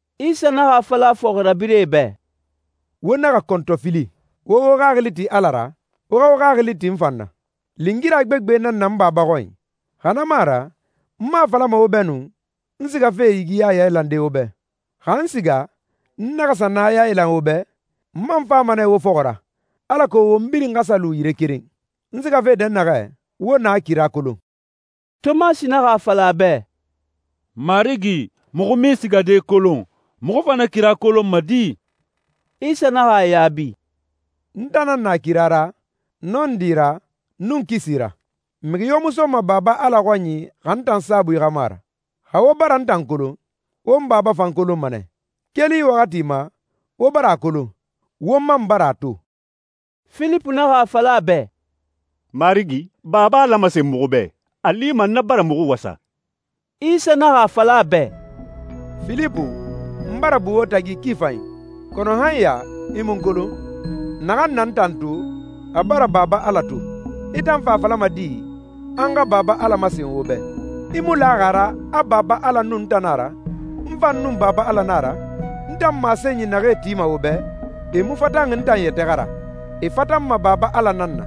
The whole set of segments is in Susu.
Isa naxa a fala a fɔxirabirɛe bɛ, «Wo naxa kɔntɔfili. Wo wo xaxili ti Ala ra, wo xa wo xaxili ti n fan na. Lingira gbegbe nan na n Baba xɔnyi, xa na mu a ra n mu a falama wo bɛ nu, a n sigafe yigiya yailande wo bɛ. Xa n siga, n naxa sa na yailan wo bɛ, n man fama nɛ wo fɔxɔ ra, alako won birin xa sa lu yire keren. N sigafe dɛnnaxɛ, wo na kira kolon.» Tomasi naxa a fala a bɛ, «Marigi, muxu mu i sigade kolon. Muxu fa na kira kolonma di?» Isa naxa a yaabi, «N tan nan na kira ra, nɔndi ra, nun kisi ra. Mixi yo mu soma Baba Ala xɔnyi xa n tan saabui xa mu a ra. Xa wo bara n tan kolon, wo n Baba fan kolonma nɛ. Keli yi waxati ma, wo bara a kolon, wo man bara a to.» Filipu naxa a fala a bɛ, «Marigi, Baba Ala masen muxu bɛ. A lima na bara muxu wasa.» Isa naxa a fala a bɛ, «Filipu, n bara bu wo tagi ki fanyi, kɔnɔ han ya i mu n kolon? Naxan na n tan to, a bara Baba Ala to. I tan fa a falama di, a n xa Baba Ala masen wo bɛ? I mu laxi a ra a Baba Ala nun n tan nan a ra, n fan nun Baba Ala nan a ra? N tan masenyi naxee tima wo bɛ, e mu fatan n tan yɛtɛ xa ra. E fatanma Baba Ala nan na.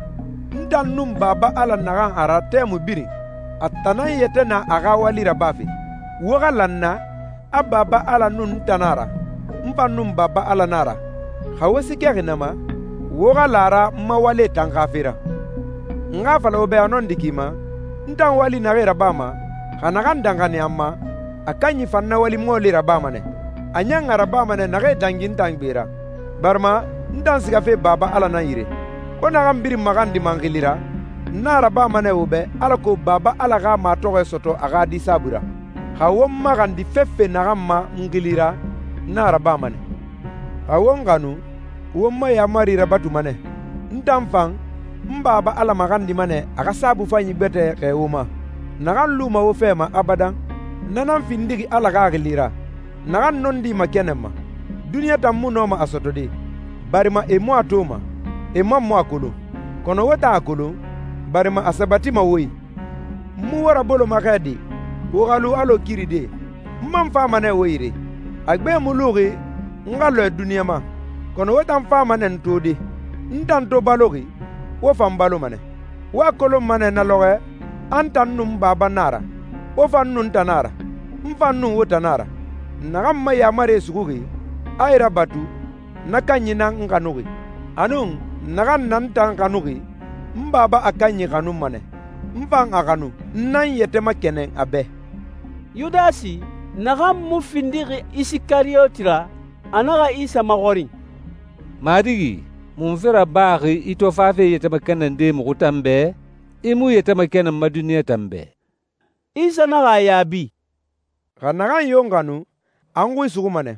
N tan nun Baba Ala naxan a ra tɛmui birin, a tan nan yɛtɛ na a xa wali rabafe. Wo xa la n na, a Baba Ala nun n tan nan a ra, n fan nun Baba Ala nan a ra. Xa wo siikɛxi na ma, wo xa la a ra n ma walie tan xa fe ra.» «N xa a fala wo bɛ a nɔndi ki ma, n tan wali naxee rabama, xa naxan danxaniya n ma, na kanyi fan na wali mɔɔlie rabama nɛ. A ɲan a rabama nɛ naxee dangi n tan gbe ra, barima n tan sigafe Baba Ala nan yire. Wo naxan birin maxandima n xili ra, n a rabama nɛ wo bɛ alako Baba Ala xa matɔxɔɛ sɔtɔ a xa Di saabui ra. Xa wo n maxandi fefe naxan ma n xili ra, n a rabama nɛ.» «Xa wo n xanu, wo n ma yaamarie rabatuma nɛ. N tan fan, n Baba Ala maxandima nɛ a xa Saabui Fanyi gbɛtɛ xɛɛ wo ma, naxan luma wo fɛ ma abadan. Na nan findixi Ala Xaxili ra, naxan nɔndi makɛnɛnma. Duniɲa tan mu nɔma a sɔtɔde, barima e mu a toma, e man mu a kolon. Kɔnɔ wo tan a kolon, barima a sabatima wo i.» «N mu wo raboloma xɛ de, wo xa lu alɔ kiridie. N man fama nɛ wo yire. A gbe mu luxi n xa lɔɛ duniɲa ma, kɔnɔ wo tan fama nɛ n tode. N tan to baloxi, wo fan baloma nɛ. Wo a kolonma nɛ na lɔxɔɛ, a n tan nun n Baba nan a ra, wo fan nun n tan nan a ra, n fan nun wo tan nan a ra. Naxan n ma yaamarie suxuxi, a e rabatu, na kanyi nan n xanuxi. Anun, naxan na n tan xanuxi, n Baba a kanyi xanuma nɛ, n fan a xanu, n nan n yɛtɛ makɛnɛn a bɛ.» Yudasi, naxan mu findi Isikariyoti ra, a naxa Isa maxɔrin, «Marigi, munfe rabaxi i to fafe i yɛtɛ makɛnɛnde muxu tan bɛ, i mu i yɛtɛ makɛnɛn duniɲa tan bɛ?» Isa naxa a yaabi, «Xa naxan yo n xanu, a n xui suxuma nɛ.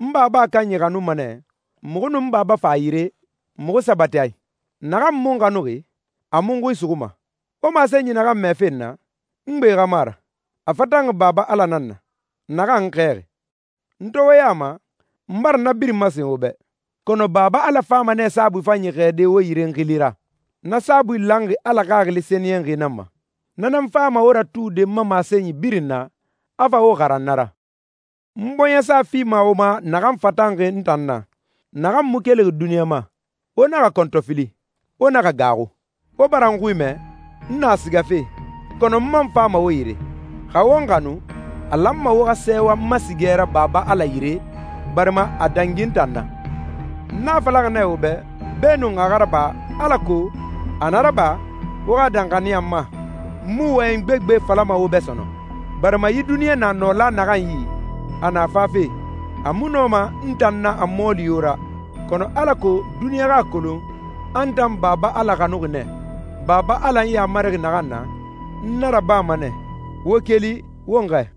N Baba a kanyi xanuma nɛ, muxu nun n Baba fa a yire, muxu sabati a i. Naxan mu n xanuxi, a mu n xui suxuma. Wo masenyi naxan mɛfe n na, n gbe xa mu a ra. A fatanxi Baba Ala nan na, naxan n xɛɛxi.» «N to wo ya ma, n bara na birin masen wo bɛ, kɔnɔ Baba Ala fama nɛ Saabui Fanyi xɛɛde wo yire n xili ra. Na saabui lanxi Ala Xaxili Sɛniyɛnxi nan ma. Na nan fama wo ratude n ma masenyi birin na, a fa wo xaran na ra.» «N bɔɲɛsa fima wo ma naxan fatanxi n tan na, naxan mu kelixi duniɲa ma. Wo naxa kɔntɔfili, wo naxa gaaxu. Wo bara n xui mɛ, ‹N na sigafe, kɔnɔ n man fama wo yire›. Xa wo n xanu, a lanma wo xa sɛɛwa n ma sigɛ ra Baba Ala yire, barima a dangi n tan na. N a falaxi nɛ wo bɛ, beenun a xa raba, alako a na raba, wo xa danxaniya n ma.» «N mu wɔyɛn gbegbe falama wo bɛ sɔnɔn, barima yi duniɲa na nɔla naxan yi, a na fafe. A mu nɔma n tan na a mɔɔli yo ra, kɔnɔ alako duniɲa xa a kolon a n tan Baba Ala xanuxi nɛ, Baba Ala n yamarixi naxan na, n a rabama nɛ. Wo keli, won xɛɛ.»